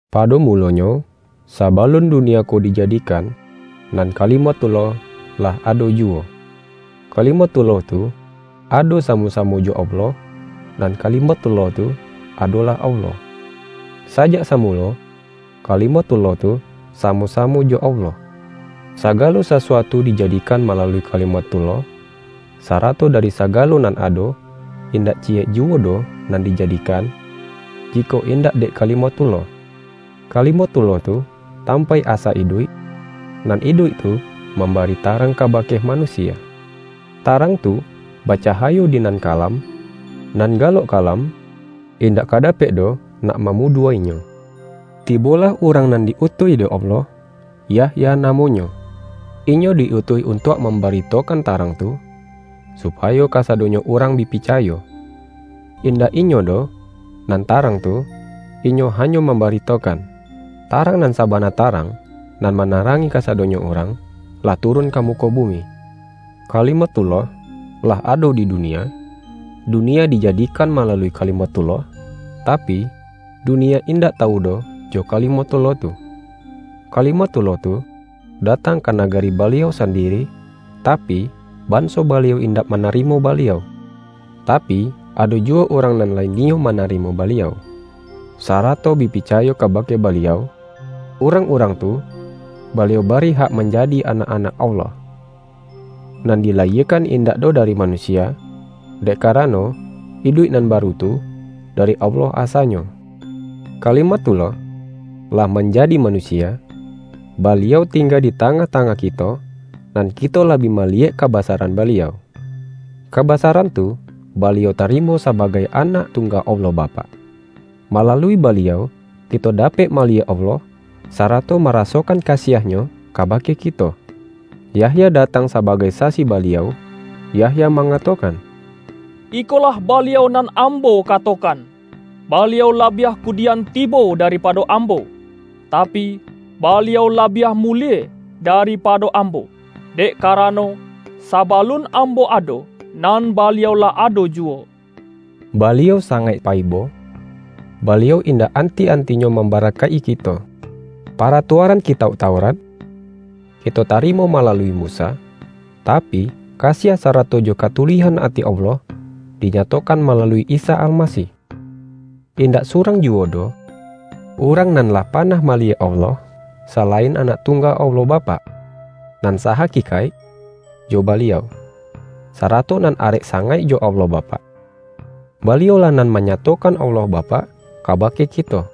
Pado mulonyo, sabalun dunia ko dijadikan, nan Kalimathullah, lah ado juwo. Kalimathullah tu, ado samo-samo jo Allah, nan Kalimathullah tu, adolah Allah. Sajak samulo, Kalimathullah tu samo-samo jo Allah. Sagalo sasuatu dijadikan malalui Kalimathullah, sarato dari sagalo nan ado, indak ciyek juwo doh nan dijadikan, jikok indak dek Kalimathullah. Kalimathullah tu, tampaik asa iduik, nan iduik tu mambari tarang kabake manusia. Tarang tu bacahayo di nan kalam, nan galok kalam, indak ka dapek doh nak mamudua-inyo. Tibolah urang nan di-utuih dek Allah, Yahya namonyo. Inyo di-utuih untuak mambaritokan Tarang tu, supayo kasadonyo urang bi picayo. Indak inyo doh, nan Tarang tu, inyo hanyo mambaritokan. Tarang nan sabana Tarang, nan manarangi kasadonyo urang, lah turun ka muko bumi. Kalimathullah, lah ado di dunia, dunia dijadikan malalui Kalimathullah, tapi, dunia indak tawu doh jo Kalimathullah tu. Kalimathullah tu datang ka nagari Baliau sandiri, tapi, banso Baliau indak manarimo Baliau. Tapi, ado juwo urang nan lai niyo manarimo Baliau, sarato bi picayo kabake Baliau, urang-urang tu, Baliau bari hak manjadi anak-anak Allah, nan dilayiekan indak doh dari manusia, dek karano, iduik nan baru tu, dari Allah asanyo. Kalimathullah, lah manjadi manusia, Baliau tingga di tangah-tangah kito, nan kito lah bi maliyek kabasaran Baliau. Kabasaran tu, Baliau tarimo sabagai Anak Tungga Allah Bapak. Malalui Baliau, kito dapek maliyek Allah, sarato marasokan kasiah-Nyo kabake kito. Yahya datang sabagai sasi Baliau, Yahya mangatokan:”Ikolah Baliau nan ambo katokan: Baliau labiah kudian tibo daripado ambo, tapi, Baliau labiah mulie daripado ambo, dek karano, sabalun ambo ado, nan Baliau lah ado juwo.” Baliau sangaik paibo, Baliau indak anti-antinyo mambarakaik-i kito. Paratuaran Kitauk Taurat, kito tarimo malalui Musa. Tapi, kasiah sarato jo katuluihan ati Allah, dinyatokan malalui Isa Almasih. Indak surang juwo doh urang nan lah panah maliyek Allah, salain Anak Tungga Allah Bapak, nan sahakikaik jo Baliau, sarato nan arek sangaik jo Allah Bapak. Baliau-lah nan manyatokan Allah Bapak kabake kito.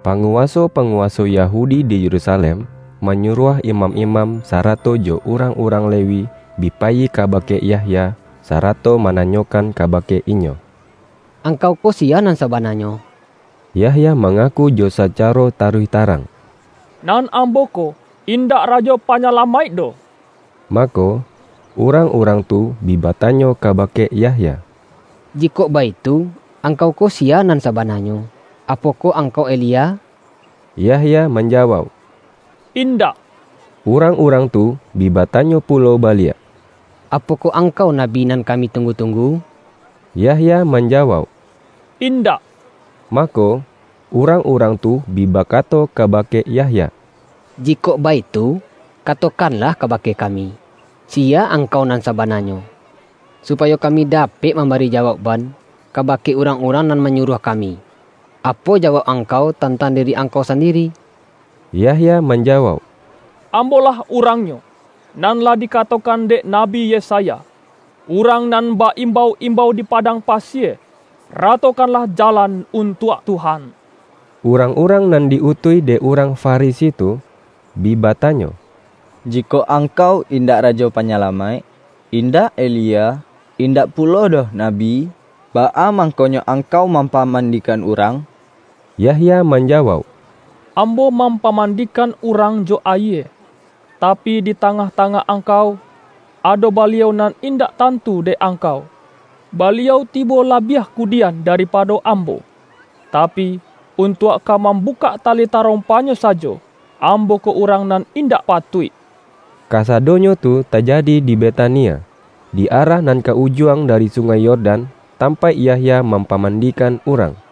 Panguwaso-panguwaso Yahudi di Yerusalem, manyuruah imam-imam, sa-rato jo urang-urang Lewi, bi payi kabake Yahya, sarato mananyokan kabake inyo,”Angkau ko siya nan sabananyo?” Yahya mangaku jo sacaro taruih tarang,”Nan ambo ko, indak Rajo Panyalamaik doh.” Mako, urang-urang tu bi batanyo kabake Yahya,”Jikok baitu, angkau ko siya nan sabananyo? Apokoh ang-kau Elia?” Yahya manjawauk,”Indak.” Urang-urang tu bi batanyo pulo ba-liak”Apokoh angkau nabi nan kami tunggu-tunggu?” Yahya manjawauk,”Indak.” Mako, urang-urang tu bi bakato kabake Yahya,”Jikok baitu, katokan-lah kabake kami, siya angkau nan sa-bananyo, supayo kami dapek mambari jawaukban, kabake urang-urang nan manyuruah kami. Apo jawauk angkau tantang diri angkau sandiri?” Yahya manjawauk,”Ambolah urangnyo, nan lah dikatokan dek Nabi Yesaya: ’Urang nan ba-imbau-imbau di padang pasie: Ratokanlah jalan untuak Tuhan.’” Urang-urang nan di-utuih dek urang Farisi tu, bi batanyo,”Jikok angkau indak Rajo Panyalamaik, in-dak Elia, indak pulo doh nabi, baa mangkonyo angkau mampamandi-kan urang?” Yahya manjawauk,”Ambo mam-pamandikan urang jo ayie. Tapi, di ta-ngah-tangah angkau, ado Baliau nan indak tantu dek angkau. Baliau ti-bo labiah kudian daripado ambo, ta-pi, untuak ka mambukak tali tarom-pa-Nyo sajo, ambo ko urang nan indak patuik.” Kasadonyo tu tajadi di Betania, di arah nan ka Ujuang dari Sungai Yordan, tampaik Yahya mampaman-dikan urang.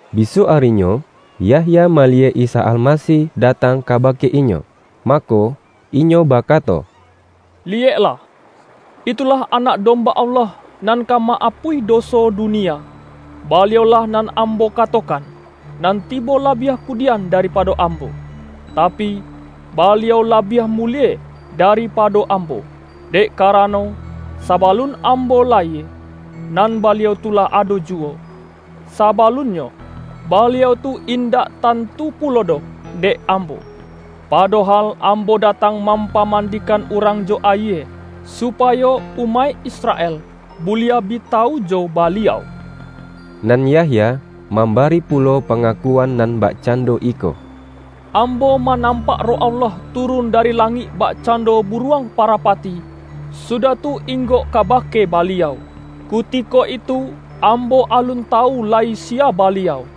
Bisuak arinyo, Yahya maliyek Isa Almasih datang kabake inyo. Mako, inyo bakato,”Liyeklah, itulah Anak Domba Allah nan ka ma-apuih doso dunia. Baliau-lah nan ambo kato-kan, nan tibo labiah kudian daripado ambo, tapi, Baliau labiah mulie dari-pado ambo, dek karano, sabalun am-bo layie, nan Baliau tu lah ado juwo. Sabalunnyo, Baliau tu indak tan-tu pulo doh dek ambo. Padohal, am-bo datang mampamandikan urang jo ayie, supayo umaik Israel buliah bi ta-wu jo Baliau.” Nan Yahya, mambari pulo panga-kuan nan bakcando iko,”Ambo ma-nampak Roh Allah turun dari langik bakcando buruang parapati, sudah tu inggok kabake Baliau. Kutiko itu, ambo alun tawu lai siya Baliau.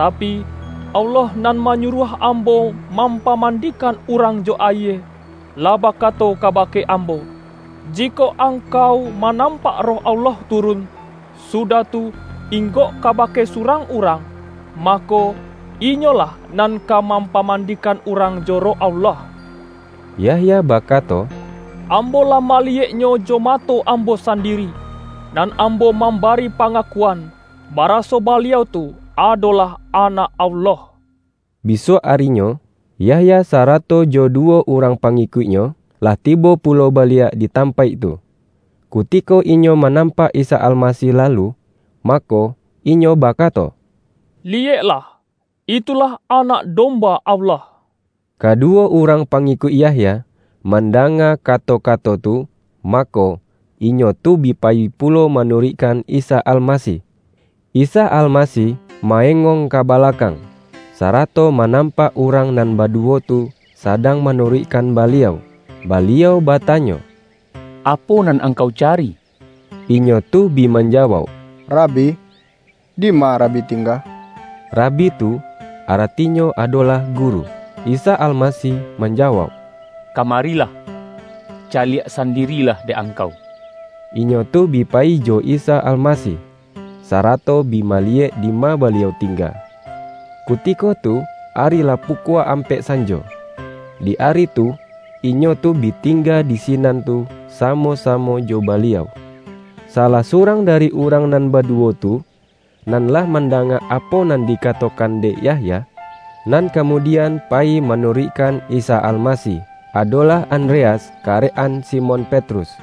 Tapi, Allah nan manyuruah ambo mampa-mandikan urang jo ayie, lah bakato kabake ambo, ’Jikok angkau manam-pak Roh Allah turun, sudah tu, ing-gok kabake surang urang, mako, Inyo lah nan ka mampamandikan urang jo Roh Allah.’” Yahya bakato,”ambo lah maliyek-Nyo jo mato ambo sandiri. Nan ambo mambari pangakuan, bara-so Baliau tu, adolah Anak Allah.” Bisuak arinyo, Yahya sarato jo duwo urang pangikuiknyo, lah tibo pulo baliak di tampaik tu. Kutiko inyo manampak Isa Almasih lalu, mako, inyo bakato,”Li-yeklah! Itulah Anak Domba Allah.” Kaduwo urang pangikuik Yahya, mandanga kato-kato tu, mako, inyo tu bi payi pulo manuruikkan Isa Almasih. Isa Almasih ma-engong ka balakang, sarato manampak urang nan baduwo tu sadang manuruikkan Baliau. Baliau batanyo,”Apo nan angkau cari?” Inyo tu bi manjawauk,”Rabi, dima Rabi tingga?” ('Rabi' tu, aratinyo ado-lah guru.) Isa Almasih manjawauk,”Kamari-lah, caliak sandirilah dek angkau.” Inyo tu bi payi jo Isa Almasih, sarato bi mali-yek dima Baliau tingga. Kutiko tu ari lah pukua ampek sanjo. Di ari tu, inyo tu bi tingga di sinan tu samo-samo jo Baliau. salah surang dari urang nan badu-wo tu, nan lah mandanga apo nan di-katokan dek Yahya, nan kamudian payi manuruikkan Isa Almasih, adolah An-dreas, karek-an Simon Petrus.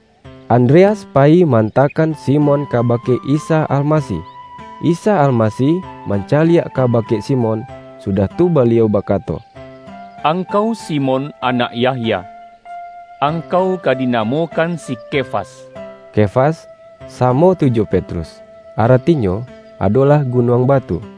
Andreas payi ma-antakan Simon kabake Isa Almasih. Isa Almasih mancaliak kabake Simon, sudah tu Baliau bakato,”Angkau Simon, anak Yahya. Angkau ka dinamokan si Kefas.” (Kefas samo tu jo Petrus, arati-nyo adolah: gunuang batu.)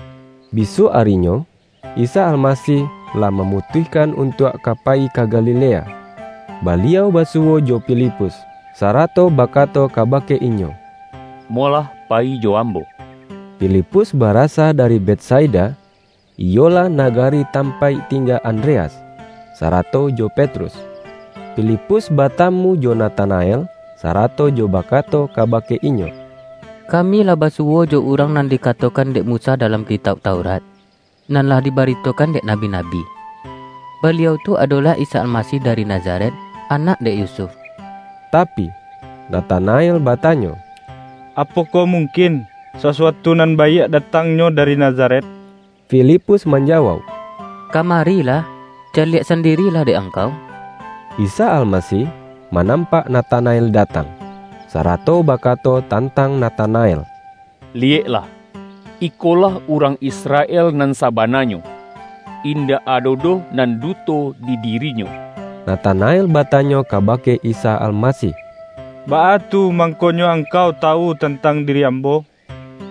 Bisuak arinyo, Isa Almasih lah ma-mutuihkan untuak ka payi ka Galilea. Baliau basuwo jo Filipus, sarato baka-to kabake inyo,”Molah payi jo Ambo!” Filipus barasa dari Betsaida, iyolah nagari tampaik tingga Andreas, sara-to jo Petrus. Filipus batamu jo Na-tanael, sarato jo bakato kabake inyo,”Kami lah basuwo jo Urang nan dika-tokan dek Musa dalam Kitauk Taurat, nan lah dibaritokan dek nabi-nabi. Baliau tu adolah Isa Almasih dari Na-zaret, anak dek Yusuf.” Tapi, Natanael batanyo,”Apokoh mungkin, sasuatu nan baiak datang-nyo dari Nazaret?” Filipus manjawauk,”Kamarilah, ca-liak sandiri lah dek angkau.” Isa Almasih manampak Natana-el datang, sarato bakato tantang Na-tanael,”Liyeklah, ikolah urang Isra-el nan sabananyo. Indak ado doh nan duto di dirinyo.” Natanael batanyo kabake Isa Almasih,”Baa tu mangkonyo Angkau tawu tantang diri ambo?”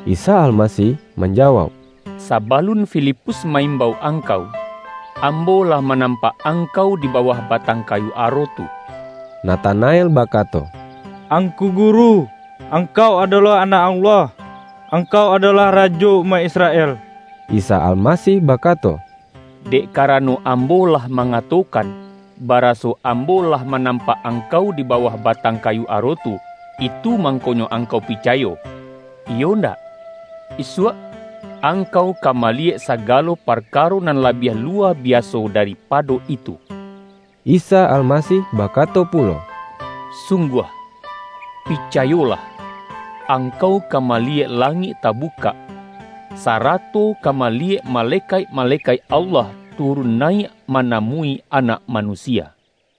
Isa Almasih manjawauk,”Sabalun Filipus ma-imbau angkau, Ambo lah manampak angkau di bawah batang kayu aro tu.” Natanael bakato,”Angku Guru, Angkau adolah Anak Allah! Angkau adolah Rajo umaik Israel!” Isa Almasih bakato,”Dek karano Ambo lah mangatokan, baraso Ambo lah manampak angkau di bawah ba-tang kayu aro tu, itu mangkonyo ang-kau picayo, iyo ndak? Isuak, angkau ka maliyek sagalo parkaro nan labiah lu-wa biaso daripado itu!” Isa Almasih bakato pulo,”Sungguah, picayolah, angkau ka maliyek langik tabukak, sarato ka maliyek malekaik-malekaik Allah turun nayiak manamui Anak Manusia.” YAHYA